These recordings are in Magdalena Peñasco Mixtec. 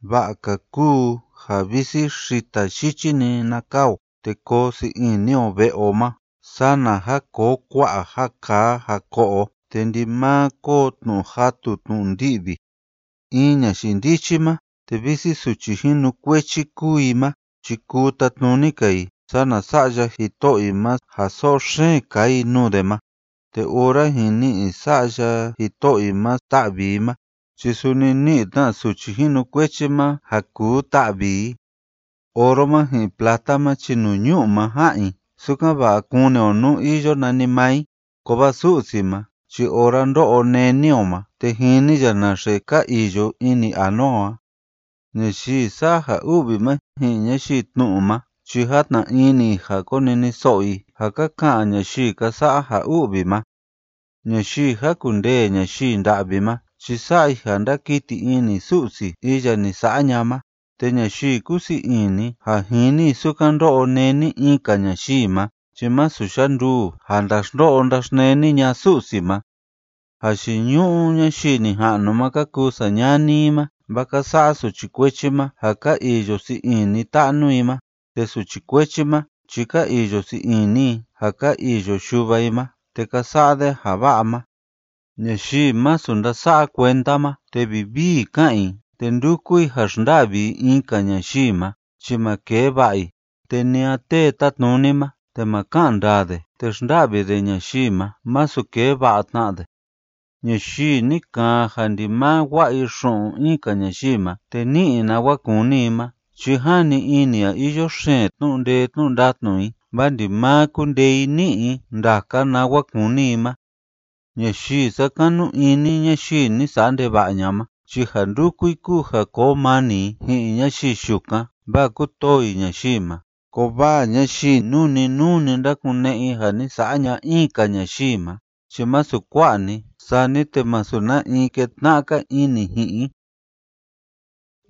Va'a‑ka kúu ja visi xita yichi‑ni na kaa o te koo sii ini o ve'e o ma sana ja koo kua'a ja kaa ja ko'o o te ndimaa koo tnu'u jatu tnu'u ndi'vi. In ñayii ndichi ma, te visi suchi jinukuechi kúu i ma chi kuu tatnuni‑ka i sana sa'ya jito'o i ma ja so'o xeen kaa i nuu de ma, te ora jin ni'i sa'ya jito'o i ma ta'vi i ma chi suni ni'i tna suchi jinukuechi ma ja kuu ta'vi i. Oro ma ji'in plata ma chi nuu ñu'u ma ja'an i sukan‑va'a kuni o nú iyo nanimaa i, kovaa Su'si ma chi ora ndó'o néni o ma, te jini ya naxe ka iyo ini anua o a. Ñayii sa'a ja u'vi ma ji'in ñayii tnu'u ma chi játna ini i ja koniniso'o i ja ka ka'an ñayii ka sa'a ja u'vi ma. Ñayii jákundee ñayii nda'vi ma chi sa'a i ja ndákiti ini Su'si iya ni sa'a ña'a ma, te ñayii kúsii ini ja jini i sukan ndó'o néni in‑ka ñayii ma chi masu yanduu ja ndaxndo'o ndaxneni ña'a Su'si ma. Jayiñu'u ñayii nija'nu ma ka kuu sañani i ma, vaa ka sa'a suchi kuechi ma ja ka iyo sii ini ta'nu i ma. Te suchi kuechi ma chi ka iyo sii ini i ja ka iyo yuva i ma te ka sa'a de ja va'a ma. Ñayii masu ndása'a kuenda ma te vivii ká'an i te ndúku i ja xnda'vi i in‑ka ñayii ma, chi ma kee va'a i. Te ni a tee tátnuni ma te ma ka'an ndaa de te xnda'vi de ñayii ma, masu kee va'a tna de. Ñayii ni kaan ja ndimaa wa'a i xu'un in‑ka ñayii ma te ní'i i nawa kúni i ma, chi jani ini i ja iyo xeen tnu'u ndatnu i, vaa ndimaa kúndee i ní'i i ndaka nawa kúni i ma. Ñayii sákanu ini ñayii ni sa'a ndeva'a ña'a ma chi ja ndúku i kúu ja koo mani i ji'in ñayii yukan, vaa kútoo i ñayii ma, kovaa ñayii nuu‑ni nuu‑ni ndákune'e i ja ni sa'a ña'a in‑ka ñayii ma chi masu kua'a‑ni, sani te masu na in ketna'a‑ka ini ji'in i.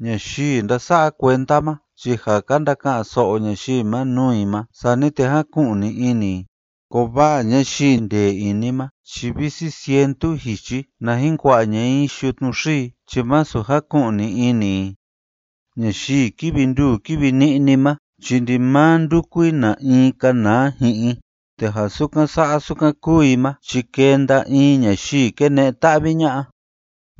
Ñayii ndása'a kuenda ma chi ja ka ndaka'an‑so'o ñayii ma nuu i ma, sani te jáku'ni ini i, kovaa ñayii ndee ini ma chi visi cientu jichi na jin kua'a ña'a i yutnu xii chi masu jaku'ni ini i. Ñayii kívi nduu kívi ni'ni ma chi ndimaa ndúku i na in kanaa ji'in i, te ja sukan sa'a sukan kúu i ma chi kenda in ñayii kene'e ta'vi ña'a.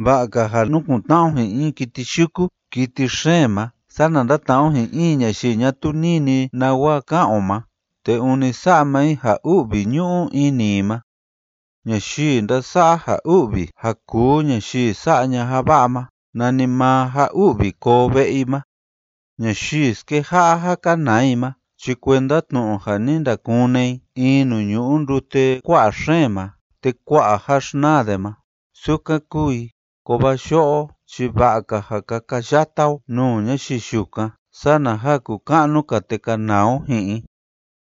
Va'a‑ka ja nukun‑tna'a o ji'in in kiti yuku kiti xeen ma sana ndatna'a o ji'in in ñayii ñatuu nini nawa ka'an o ma te ûni sa'a maa i ja u'vi ñu'u ini i ma. Ñayii ndasa'a ja u'vi ja kuu ñayii sa'a ña'a ja va'a ma, nanimaa ja u'vi koo ve'e i ma. Ñayii skeja'a ja kanaa i ma chi kuenda tnu'u ja ni ndakune i in nuu ñu'u ndute kua'a xeen ma te kua'a ja xnaa de ma, sukan kúu i, kovaa yo'o chi va'a‑ka ja kakayata o nuu ñayii yukan sana ja kuka'nu‑ka te kanaa o ji'in i.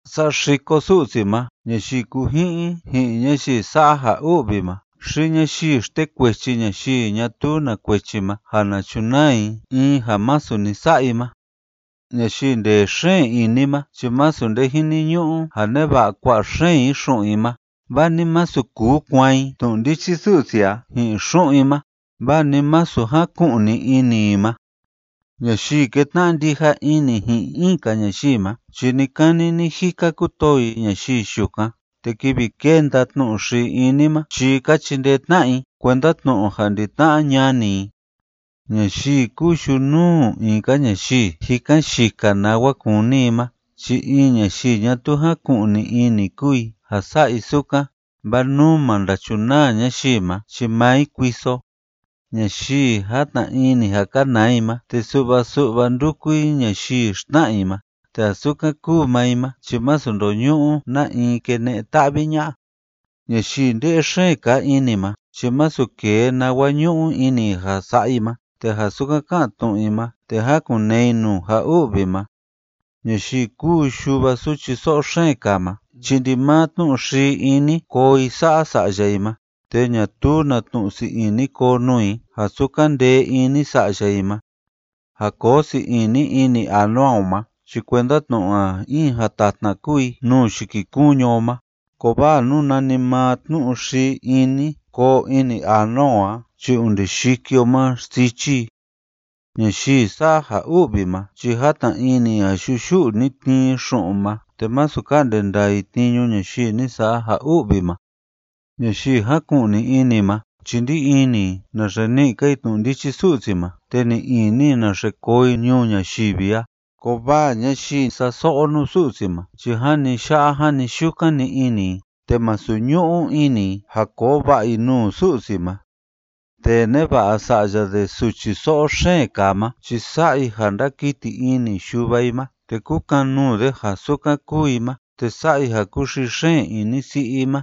Saxiko Su'si ma ñayii kúji'in ji'in ñayii sa'a ja u'vi ma xi ñayii xtekuechi ñayii ñatuu na kuechi ma ja na chunaa i in ja masu ni sa'a i ma. Ñayii ndee xeen ini ma chi masu nde jiniñu'u ja neva'a kua'a xeen i xu'un i ma, vaa ni masu kuu kuaan i tnu'u ndichi Su'si a ji'in xu'un i ma, vaa ni masu jaku'ni ini i ma. Ñayii kétna'a ndija ini ji'in in‑ka ñayii ma chi ni‑kani ni‑jika kútoo i ñayii yukan, te kivi kénda tnu'u xii ini ma chi ka chindee tna'a i kuenda tnu'u ja ndi-tna'a ñani i. Ñayii kúu yunuu in‑ka ñayii jikan yika nawa kúni i ma chi in ñayii ñatuu jáku'ni ini kúu i ja sa'a i sukan, vaa nú ma ndachunaa ñayii ma chi maa i kuiso. Ñayii játna ini ja kanaa i ma te su'va su'va ndúku i ñayii xtna'a i ma, te ja sukan kúu maa i ma chi masu ndóñu'u na in kene'e ta'vi ña'a. Ñayii nde'e xeen kaa ini ma chi masu kee nawa ñu'u ini i ja sa'a i ma, te ja sukan ká'an tnu'u i ma, te jákun‑nee i nuu ja u'vi ma. Ñayii kúu yuva suchi so'o xeen kaa ma chi ndimaa tnu'u xii ini koo i sa'a sa'ya i ma, te ñatuu na tnu'u sii ini koo nuu i ja sukan ndee ini sa'ya i ma. Ja koo sii ini ini anua o ma chi kuenda tnu'u ja in jatatna kúu i nuu yikikuñu o ma, kovaa nú nanimaa tnu'u xii ini koo ini anua o a chi onde yiki o ma xsichi i. Ñayii sa'a ja u'vi ma chi játna ini i ja yuyu'u‑ni tnii i xu'un ma, te masu ka'nde ndaa i tniñu ñayii ni sa'a ja u'vi ma. Ñayii jáku'ni ini ma chi ndí ini i naxe ni'i‑ka i tnu'u ndichi Su'si ma te ni'i ini i naxe koo i ñuu ñayivi a, kovaa ñayii sa'a so'o nuu Su'si ma chi jani ya'a jani yukan‑ni ini i, te masu ñu'u ini i ja koo va'a i nuu Su'si ma. Tee neva'a sa'ya de suchi so'o xeen kaa ma chi sa'a i ja ndákiti ini yuva i ma te kúkan‑nuu de ja sukan kúu i ma, te sa'a i ja kúxii xeen ini si'i i ma.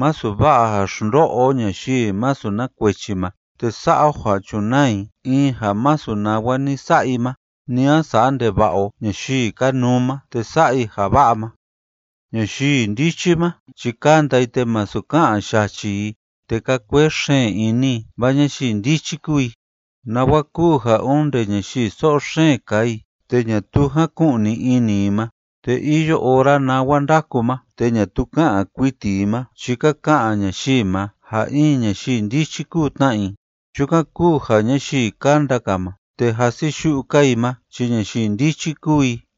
Masu va'a ja xndo'o o ñayii masu na kuechi ma te sa'a o ja chunaa i in ja masu nawa ni sa'a i ma, ni a sa'a ndeva'a o ñayii kanuu ma te sa'a i ja va'a ma. Ñayii ndichi ma chi kánda i te masu ká'an yachi i te kaa kuee xeen ini i, vaa ñayii ndichi kúu i. Nawa kúu ja onde ñayii so'o xeen kaa i te ñatuu jáku'ni ini i ma te iyo ora nawa ndáku ma te ñatuu ká'an kuiti i ma, chi ka ka'an ñayii ma ja in ñayii ndichi kúu tna i. Chukan kúu ja ñayii kánda‑ka ma te jasiyu'u‑ka i ma chi ñayii ndichi kúu i.